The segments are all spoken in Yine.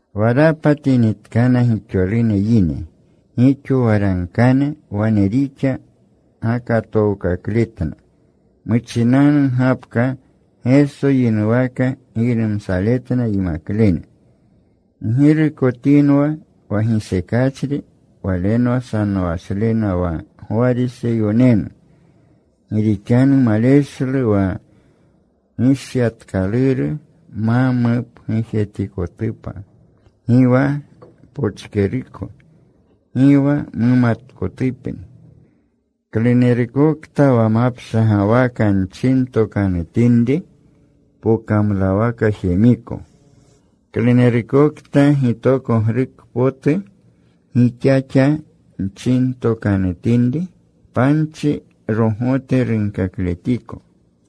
Wa rapatinitkana gixolune yine, gixo waragkane, wane rixa gakatookakletna. Muchinanu gapka Geso yinuwaka giynumsaletna yimaklene, “Ggirukotinwa wa gisekachri, walenwa sanowashlena, wa Gwariseyonenu. Gi rixanu maleshlu wa gishyatkaluru ma mupgujetikotupa. Gi wa pochkeruko gi wa mumatkotupni. Klunerukokta wa mapshagwaka nchintokanutinri, pokamlawaka jemiko. Klunerukokta gitokogruko potu gixaxa nchintokanutinri, panchi gogote runkakletiko.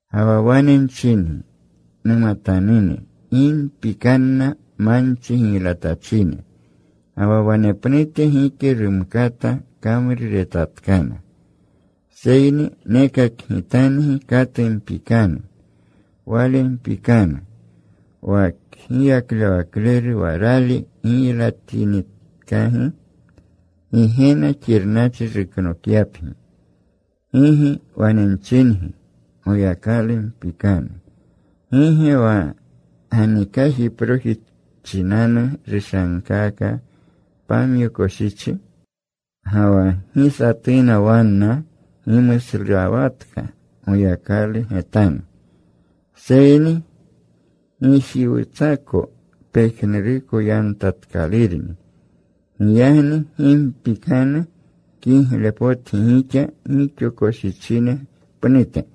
“Ga wa wane nchingi, numatanune, gi mpikanna manchi giylatachine. Ga wa wanepnute gike rumkata kamruretatkana. Seyni nekakgitangi katu mpikanu. Wale mpikanu, wa kgiyaklewakleru wa rali giylaletinitkagi Gigena xirnachri ruknokyapgi. Gigi, wane nchingi, Goyakalu mpikanu. ¿Gi ge wa ganikajproji chinanu rushankaaka pamyo koshichi? Ga wa gi satuna wanna gimuslawatka Goyakalu getanu. Seyni gijiwutsako pejnuruko yantatkalurni. Giyagni gi mpikanu. Kiglepotgi gixa gixo koshichine pnute.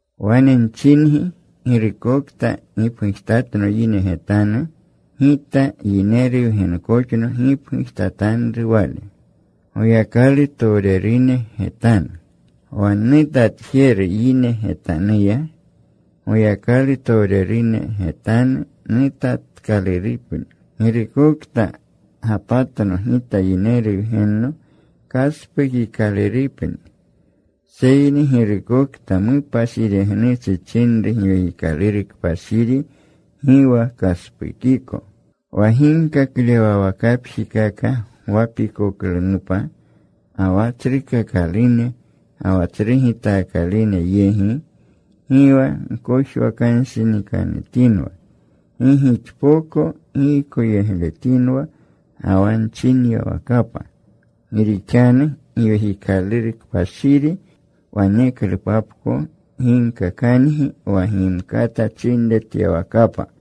“Wane nchingi, girukokta gipgujtatno yine getanu, Gita Yineru Wgenkoxno gipgujtatanru wale Goyakalutowrerune getanu. Wa nnutatjeru yine getanuya, Goyakalutowrerune getanu nutatkalurupni. Girukokta gapatno Gita Yineru Wgenno kaspukikalurupni. Seyni girukokta mupashiregnuchi chinru Giwekikaluru Kpashiri gi wa kaspukiko. “Wa ginkaklewawakapjikaka gwapikoklunupa, ga wa tsrukakalune ga wa tsru gitaakalune yegi, gi wa gkojwakanshinikanutinwa gi gixpoko giykoyegletinwa ga wa nchinyawakapa. Gi rixanu Giwekikaluru Kpashiri waneklupapko ginkakangi wa gimkata chinretyawakapa.”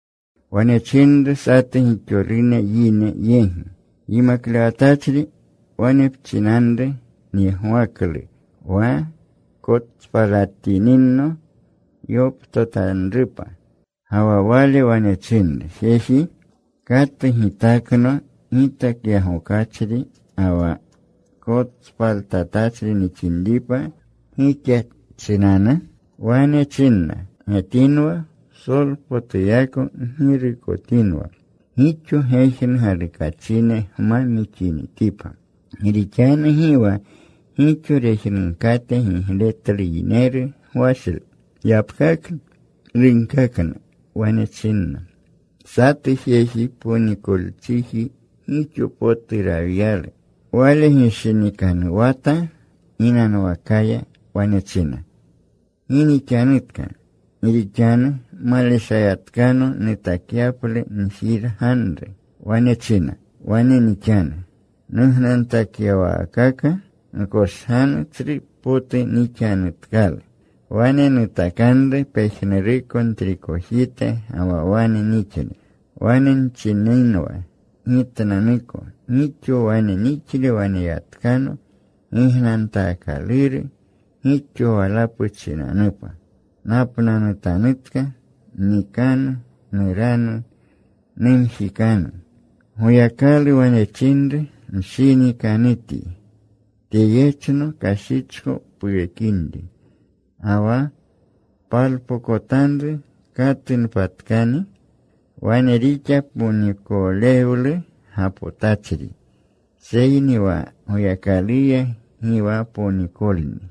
Wane chinru satu gixolune yine yegi, “Yimaklewatachri, wane pchinanru nyegwaklu wa kotspalatininno yoptotanrupa.” Ga wa Wale wane chinru, “Jeji, ¿katu gitakno gitakyagokachri ga wa kotspaltatachri nixinripa gixa chinanu?” Wane chinna, “Getinwa. Psolpotuyako ggirukotinwa gixo gejnu galukachine gma mixinitipa. Gi rixanu gi wa gixo rejnunkate gigletlu yineru gwashle.” Yapkaklu runkakna. Wane chinna, “Satu jeji ponikolchijne gixo potu rawyalu. Wale gishinikanuwata ginanwakaya. Wane china, ‘¿Gi nixanutka? Gi rixanu maleshayatkano nutakyaplu njirganru.’ “Wane china, ‘Wane nixanu. Nugnantakyawaakaka nkoshganu. Tsrupotu nixanutkalu. Wane nutakanru pejnuruko ntrikoteji ga wa wane nixle. Wane nchininwa gitnanuko, Gixo wane nixle waneyatkano gignantaakaluru gixo walapu chinanupa. Napnanutanutka. Nnikanu. Nuranu. Numjikanu.’ “Goyakalu wane chinru, ‘Mshinikanutyi. Tyeyechno kashichko puwekinri. ¿Ga wa palpokotanru katunpatkani?’ “Wane rixa ponikolewlu gapotachri, seyni wa Goyakaluya gi wa ponikolni.”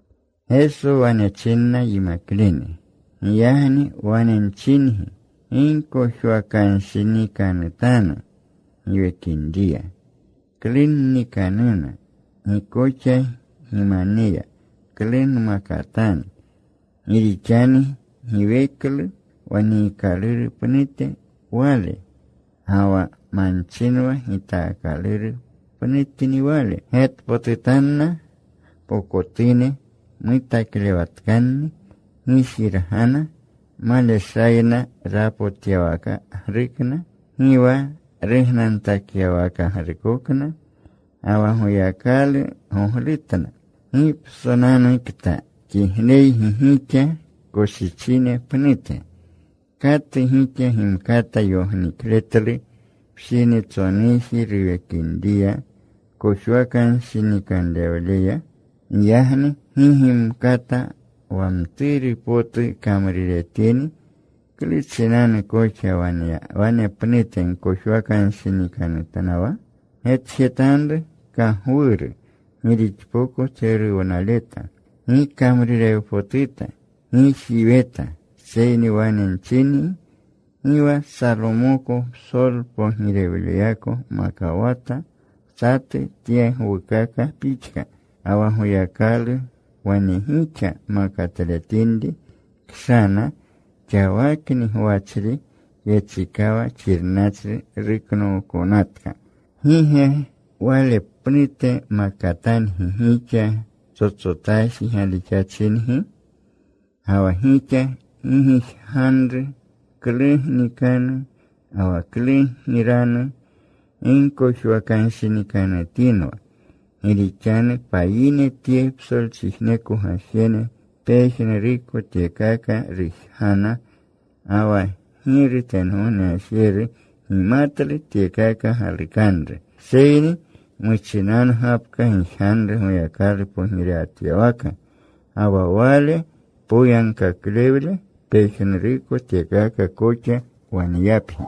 Geso wane chinna yimaklene, “Giyagni wane nchingi, gi gkojwakanshinikanutanu giwekinriya, klu gnikanuna. Gi koxa gimaneya, klu gmakatanu. Gi rixanu giweklu wa niikaluru pnutni wale, ga wa manchinwa gitaakaluru pnutni wale. Getpotutanna pokotune mutaklewatkanni. Gi jirgana. Maleshayna rapotyawakagrukna, gi wa rugnantakyawakagrukokna. Ga wa Goyakalu goglutna. ¡Gi psonanukta kigleygi gixa koshichine pnute! ¿Katu gixa gimkata yognikletlu pshinitsonuji ruwekinriya kojwakanshinikanrewleya? Giyagni gi gimkata wa mturu potu kamruretini, ¿klu chinanu koxa wanepnute gkojwakanshinikanutnawa? “Getjetanru kagwuru, gi rixpoko tseruwnaleta. Gi kamrurewpotuta. Gi jiweta. Seyni wane nchingi gi wa Salomoko psolpogirewleyako makawata satu tye gwukaka pixka. Ga wa Goyakalu wane gixa makatletinri kshana xawakni gwachri, yechikawa xirnachri ruknookonatka ¿gi ge wale pnute makatangi gixa, ptsotsotaji galixachingi? Ga wa gixa gi gijganru klu gnikanu, ga wa klu giranu. Gi gkojwakanshinikanutinwa. Gi rixanu payine tye psolchijneko gajene pejnuruko tyekaka rujgana. Ga wa Giru tengogne Gajeru gimatlu tyekaka galukanru. Seyni muchinanu gapka gijganru Goyakalu pogirewatyawaka, ga wa Wale poyagkaklewle. Pejnuruko tyekaka koxa waneyapgi.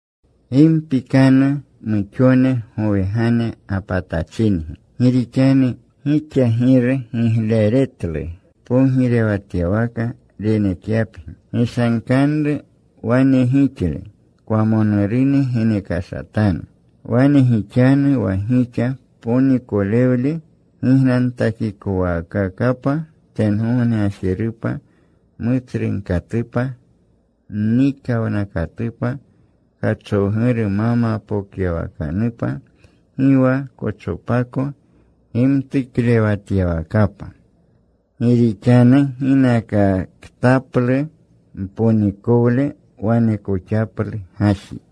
“Gi mpikanu muxone gowegane gapatachingi. Gi rixanu gixa Giru gigleretlu pogirewatyawaka renekyapgi. Gishankanru wane gixle. Kwamonurune genekashatanu. Wane gixanu wa gixa ponikolewle gignantakikowaakakapa tengogne gajerupa mutsrunkatupa, mnikawnakatupa, kachowguru ma mapokyawakanupa, gi wa kochopako gimtuklewatyawakapa. Gi rixanu ginakaktaplu mponikowle wanekoxaplu gaji.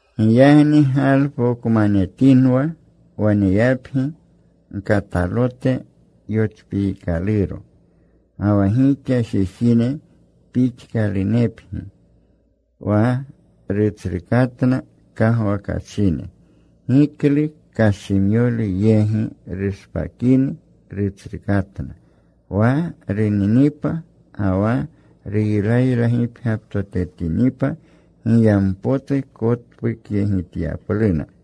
“Giyagni galpokmanetinwa, waneyapgi gkatalote yochpiikaluro. Ga wa gixa jejine pixkalunepgi, wa rutsrukatna kagwakachine, giklu kashimyolu yegi rushpakini rutsrukatna. Wa runinipa ga wa ruylaylagipgyaptotetinipa, giyampotu kotpukyegityapluna.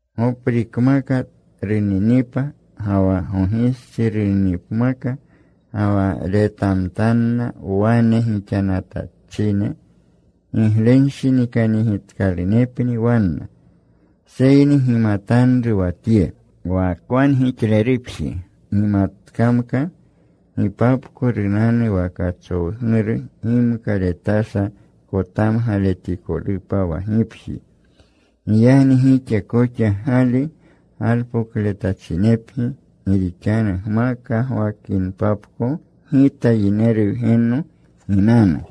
Goprikmaka runinipa ga wa gogistsi runinipmaka ga wa retamtanna wane gixanatachine, giglenshinikanyegitkalunepni wanna. Seyni gimatanru wa tye: wa kwangixlerupji gimatkamka gipapko runanu wa kachowguru, gimka retasha kotamgaletikolupa wa gipji. Giyagni gixa koxa gali galpokletachinepgi, gi rixanu gma kagwakinpapko Gita Yineru Wgenno ginanu.”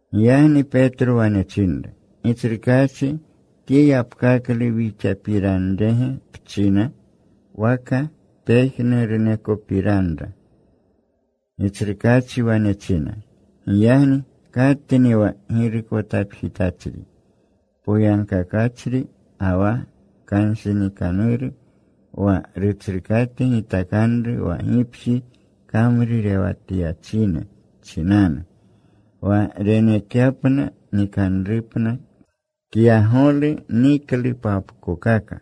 Giyagni Petro wane chinru, “Gitsrukaachi ¿tye yapkaklu wixapiranrege pchina, waka pejnurunekopiranra?” Gitsrukaachi wane china, “Giyagni ¿katni wa girukotapjitachri poyagkakachri ga wa kanshinikanuru, wa rutsrukate gitakanru wa gipji kamrurewatyachine chinanu, wa renekyapna nikanruna kyagolu niklupapkokaka?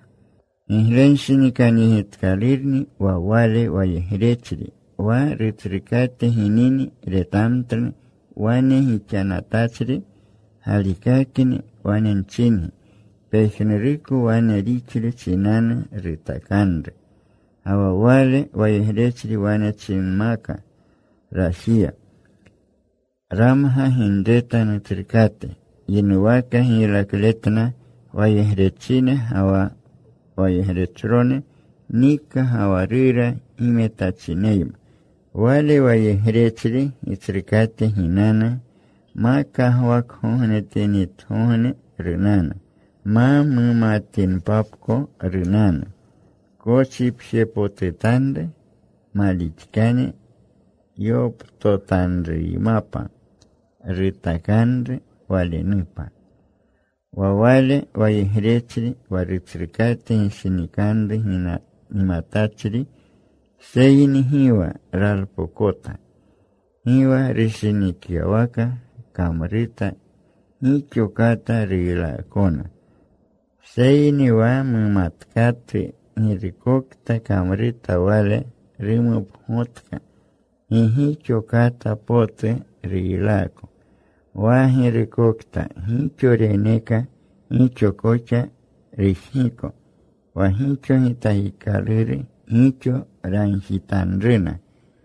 Giglenshinikanyegitkalurni wa wale wayegrechri, wa rutsrukate ginini retamtlu wane gixanatachri. Galikakni wane nchingi, pejnuruko wane rixle chinanu rutakanru. Ga wa wale wayegrechri wane chinmaka rajiya, ‘Ramga ginreta nutsrukate.’ Yinuwaka giylakletletna wayegrechine ga wa wayegrechrone; nika ga wa rura gimetachineyma. Wale wayegrechri gitsrukate ginanu. Ma kagwakgognetinitgogne runanu. Ma mumatinpapko runanu. Kochipjepotutanru. Malixkane yoptotanruymapa rutakanru walenupa. “Wa wale wayegrechri wa rutsrukate gishinikanru gimatachri seyni gi wa ralpokota, gi wa rushinikyawaka kamruta, gixo kata ruylaakona. Seyni wa mumatkatu girukokta kamruta wale rumupgotka, gi gixo kata potu ruylaako. Wa girukokta gixo reneeka, gixo koxa rujgiko. Wa gixo gitakikaluru, gixo ragjitanruna.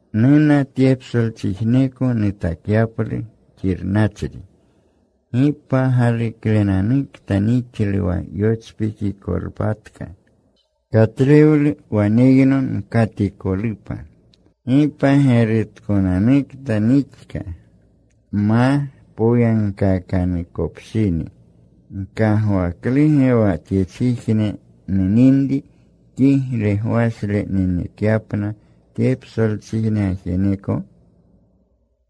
“Nuna tye psolchijneko nutakyaplu xirnachri. ¡Gi pagaluklenanukta nixlu wa yochpikikolpatka! Katlewlu waneyno nkatikolupa. ¡Gi pagerutkonanukta nixka ma poyagkaakanukopshini! ¿Gkagwakluge wa tyechijne nuninri kigle gwashle nenekyapna tye psolchijne gajeneko?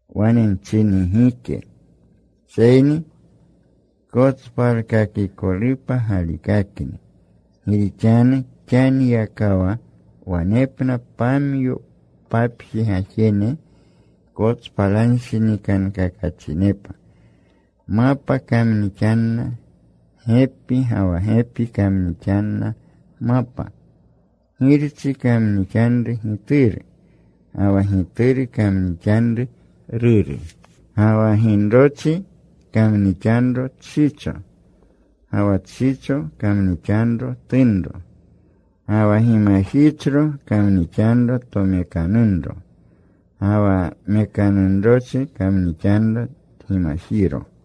Wane nchingi, gike. Seyni kotspalkakikolu galikakni. Gi rixanu xaniyakawa wanepna pamyo papji gajene kotspalanshinikankakachinepa. Mapa kamnixanna gepi, ga wa gepi kamnixanna mapa. Girchi kamnixanru gituru, ga wa gituru kamnixanru ruru. Ga wa ginrochi kamnixanro tshicho, ga wa tshicho kamnixanro tunro. Ga wa gimajichro kamnixanro tomekanunro, ga wa mekanunrochi kamnixanro tgimajiro.”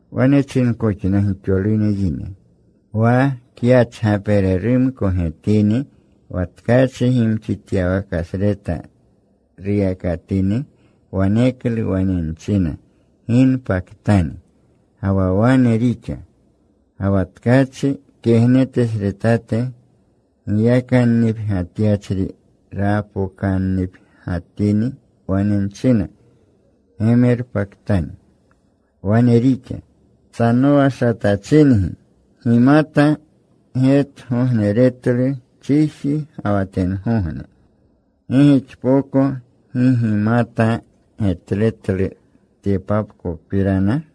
Wane chinkoxna gixolune yine, “Wa kyachgapererumko getini wa tkachi gimxityawakasreta ruyakatini, waneklu wane nchina, ‘Ginpatkani.’ Ga wa wane rixa. Ga wa tkachi kegnetesretate giyakannipgyatyachri rapokannipgyatini, wane nchina, ‘Gemerpatkani.’ Wane rixa. ¡Sanowashatachingi! Gimata getgogneretlu chiji ga wa tengogne. ¿Gi gixpoko gi gimata getletlu tyepapkopirana?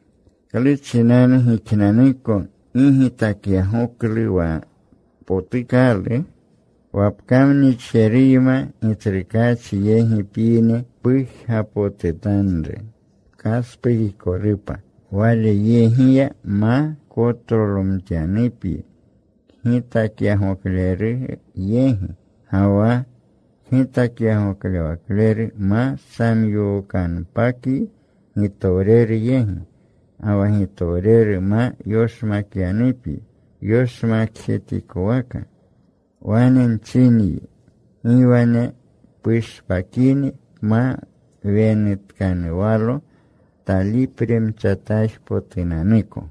“¿Klu chinanu gixnanuko gi gitakyagoklu wa potukalu? Wa pkamnixjeruyma gitsrukaachi yegi pyini, pujgapotutanru pkaspukikolupa walyegiya, ma kotlolomtyanupyi kgitakyagoklewakleru yegi. Ga wa kgitakyagoklewakleru ma samyookanpakyi gitowreru yegi. Ga wa gitowreru ma yoshmakyanupyi yoshmakjetikowaka. Wane nchinyi, gi wane pushpakini pma wenutkanuwalo talipremchataajpotunanuko.”